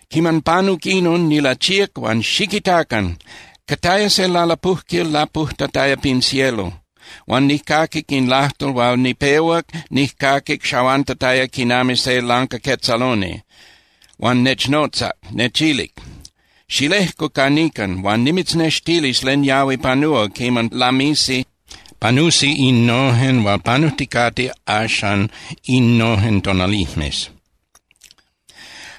Quiman panuc inon, nilachíac huan ¡xiquitacan! Cataya se lalapujquil lapujtataya pin cielo. Huan nijcaquic in lajtol hual nipehuac nijcaquic xahuantataya quinami se lancaquetzaloni. Huan nechnotzac, nechilic: —Xilejcu ca nican huan nimitznextilis len yahui panúa quiman lamisi panusi innojen hual panujticate axan innojen tonalijmes.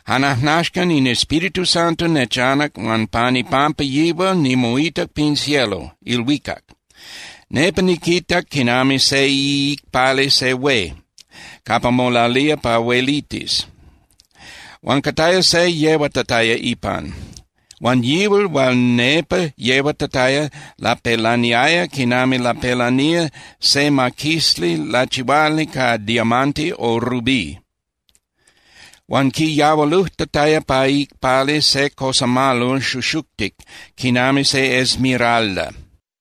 Jan ajnaxcan in Espíritu Santo nechanac huan pan ipampa yihual nimoitac pin cielo (ilhuicac). Nepa niquitac quinami se iicpali se hué capa molalía pa huelitis, huan cataya se yehuatataya ipan. Huan yihual hual nepa yehuatataya lapelaniaya quinami lapelanía se maquisli lachihuali ca diamante o rubí. Huan quiyahualujtataya pa iicpali se cosamalol xuxuctic quinami se esmeralda.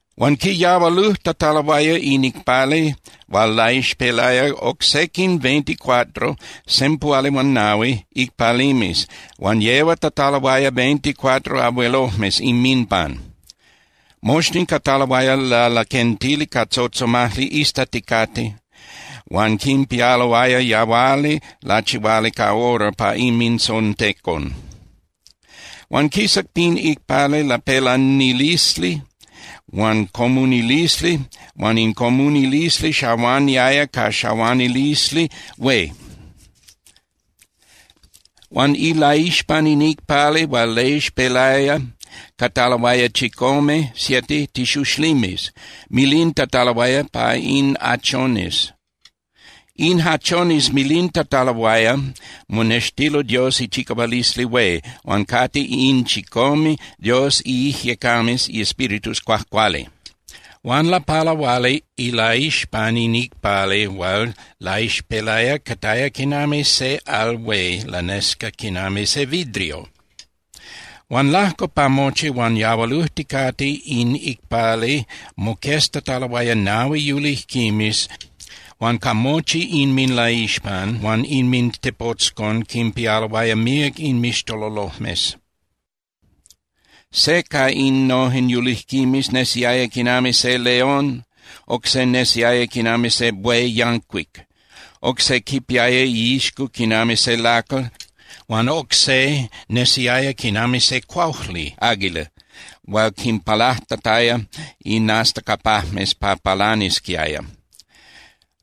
Huan quiyahualujtataloaya in icpali hual laixpelaya oc sequin veinticuatro (sempuhuali huan nahui) icpalimes huan yehuatataloaya veinticuatro abuelojmes inminpan. Moxtin cataloaya lalaquentili ca tzotzomajli iztaticate huan quinpialoaya yahuali lachihuali ca oro pa inmintzontecon. Huan quisac pin icpali lapelanilisli huan comunilisli huan in comunilisli xahuaniaya ca xahuanilisli hué. Huan ilaixpan in icpali hual laixpelaya cataloaya chicome (siete) tixuxlimes milintataloaya pa in hachones. In hachones milintataloaya monextilo Dios ichicahualisli hué huan cate In chicome Dios iIjyecames (iEspíritus) Cuajcuali. Huan lapalahuali ilaixpan in icpali hual laixpelaya cataya quinami se al hué lanesca quinami se vidrio. Huan lajco pa mochi huan yahualujticate in icpali moqueztataloaya nahui yulijquimes huan ca mochi inminlaixpan huan inmintepotzcon quinpialoaya míac inmixtololojmes. Se ca innojen yulijquimes nesiaya quinami se león, oc se nesiaya quinami se buey yancuic. Oc se quipiaya iixco quinami se lacal, huan oc se nesiaya quinami se cuaujli (águila) hual quinpalajtataya inastacapajmes pa palanisquiaya.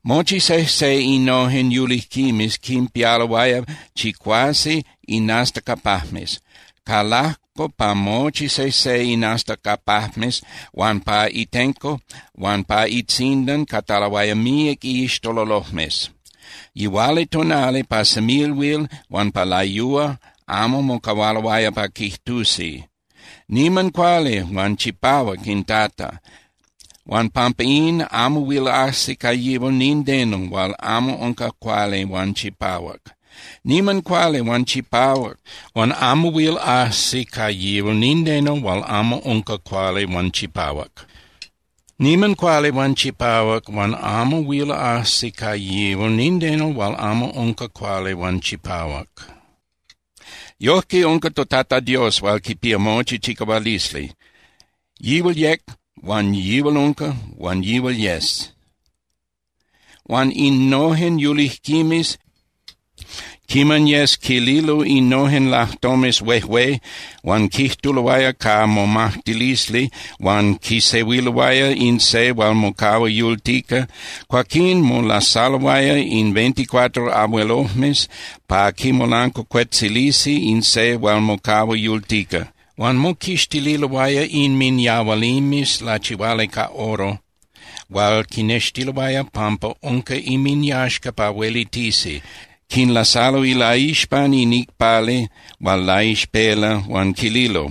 Mochi sejse innojen yulijquimes quinpialoaya chicuase inastacapajmes. Ca lajco pa mochi sejse inastacapajmes huan pa itenco huan pa itzindan cataloaya míac inmixtololojmes. Yihualitonali pa semilhuil huan pa layúa amo mocahualoaya pa quijtusi: Niman cuali huan chipahuac in Tata, huan pampa in, amo huil ajsi ca yihual nindeno hual amo unca cuali huan chipahuac, niman cuali huan chipahuac huan amo huil ajsi ca yihual nindeno hual amo unca cuali huan chipahuac, niman cuali huan chipahuac huan amo huil ajsi ca yihual nindeno hual amo unca cuali huan chipahuac. Yojque unca toTata Dios hual quipía mochi chicahualisli, yihual yec huan yihual unca huan yihual yes. Huan innojen yulijquimes, quiman yes quililo innojen lajtomes huejué huan quijtuloaya ca momajtilisli huan quisehuiloaya in se hual mocahua yultica, cuaquín molasaloaya in veinticuatro abuelojmes pa quimolancuacuetzilisi in se hual mocahua yultica. Huan moquixtililoaya inminyahualimes lachihuali ca oro hual quinextiloaya pampa unca inminyaxca pa huelitisi, quinlasalo ilaixpan in icpali hual laixpela huan quililo: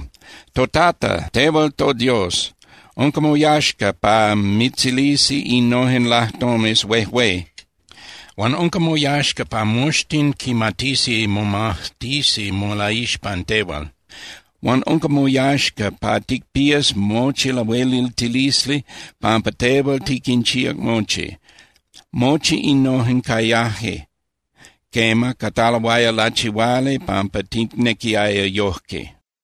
ToTata, tehual toDios, unca moyaxca pa mitzilisi innojen lajtomes huejué huan unca moyaxca pa moxtin quimatisi momajtisi molaixpan tehual. Huan unca moyaxca pa ticpías mochi lahueliltilisli, pampa tehual tiquinchíac mochi. Mochi innojen cayaje, quema, cataloaya lachihuali pampa ticnequiaya yojque.